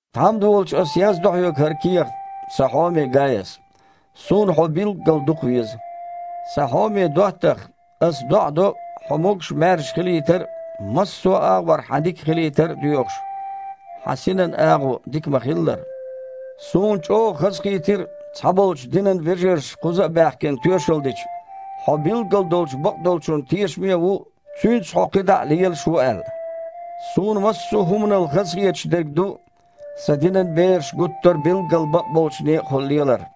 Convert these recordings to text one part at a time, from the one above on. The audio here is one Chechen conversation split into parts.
Тхьамда волчу аса яздо хьоьга хІара кехат, сан хьоме Гаяс. Суна хьо билггал дукхавеза. Сан хьоме доттагІа, ас доІа до, хьо могуш-маьрша хилийтар а, массо а агІор хьан дика хилийтар а доьхуш, хьан синан агІо дика ма-хиллара. Суна чІогІа хазахийтира, цхьаболчу динан вежарша, кхуза а баьхкина, тоьшалла дича, хьо билггал долчу бакъдолчунна тешаме а ву, цуьнца хьо кхидІа а лелаш ву аьлла. Суна массо а хІуманал хазахеташ дерг ду, сан динан бераш гуттара а билггал бакъболчу некъахула лелар.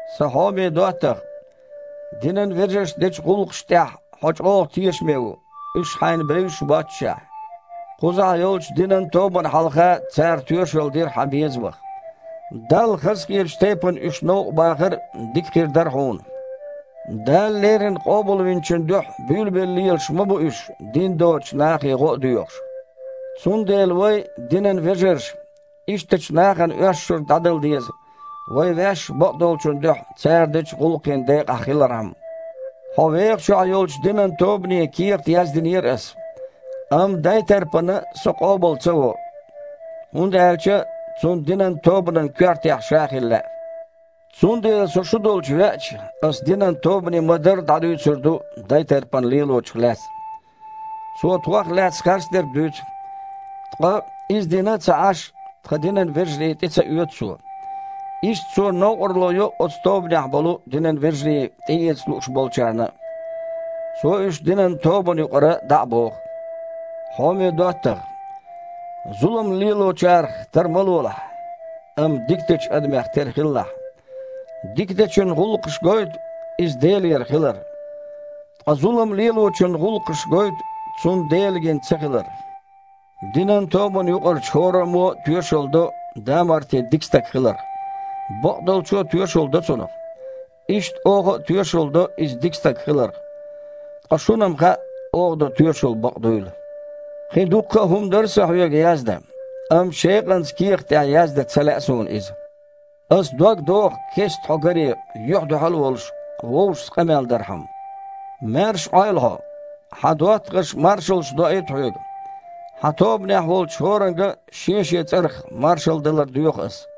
Сан хьоме доттагІа, динан вежаршна дечу гІуллакхашна тІехь хьо чІогІа тешаме ву, уьш хьайна бевзаш а боццушехь! Кхузахь йолчу динан тобанна хьалха цара тоьшалла дира хьан безамах. Далла хазахетачу тайпана уьш новкъа бахар дика хир дара хьуна. Дала леррина Къобалвинчун дуьхьа буьйлабелла лелаш ма бу уьш, дин доцучу нахе гІо а ца доьхуш. Цундела вай, динан вежарша, ишттачу нахана оьшшург дІадала деза, вай ваьш а бакъдолчун дуьхьа цара дечу гІуллакхийн декъахь хилархьама. Хьо вехачохь йолчу динан тобане кехат яздинера ас, амма Дайтарпана со къобал ца во, хІунда аьлча цунна динан тобанан коьртехь ша хила лаьа. Цундела со шу долчу веача, аса динан тобане ма-дарра дІадуьйцур ду Дайтарпана лелочух лаьцна. Цо тхох лаьцна харцдерг дуьйцу, ткъа, иза дина а ца Іаш, тхан динан вежарий тІе а ца оьцу цо. Иштта цо новкъарло йо оцу тобанехь болу и динан вежарий тІеэца лууш болчарна а. Цо уьш динан тобанна юкъара дІа а боху. Хьоме доттагІа! Зулам лелочарах тар ма лолахь, амма дика дечу адамех тера хилалахь. Дика дечун гІуллакхаша гойту – иза Делера хилар. Ткъа зулам лелочун гІуллакхаша гойту – цунна Дела гина ца хилар. Динан тобанна юкъарчу хІораммо а тоьшалла до Дамарти дика стаг хиларх. Бакъдолчо а тоьшалла до цунах. Иштта оха а тоьшалла до иза дика стаг хиларх. Ткъа шуна-м хаьа, оха до тоьшалла бакъ дуйла. Кхин дуккха а хІума дара сан хьоьга яздан, амма шекъанца кехата тІехь яздан ца лаьа суна иза. Аса дог доху, кестта хьо гаре, юьхь-дуьхьал а волуш, вовшашца къамел дархьама. Маьрша Іойла хьо! Хьан доттагІаша маршаллаш доуьйту хьоьга. Хьан тобанехь волчу хІоранга а шен-шен цІарах маршалла далар доьху ас.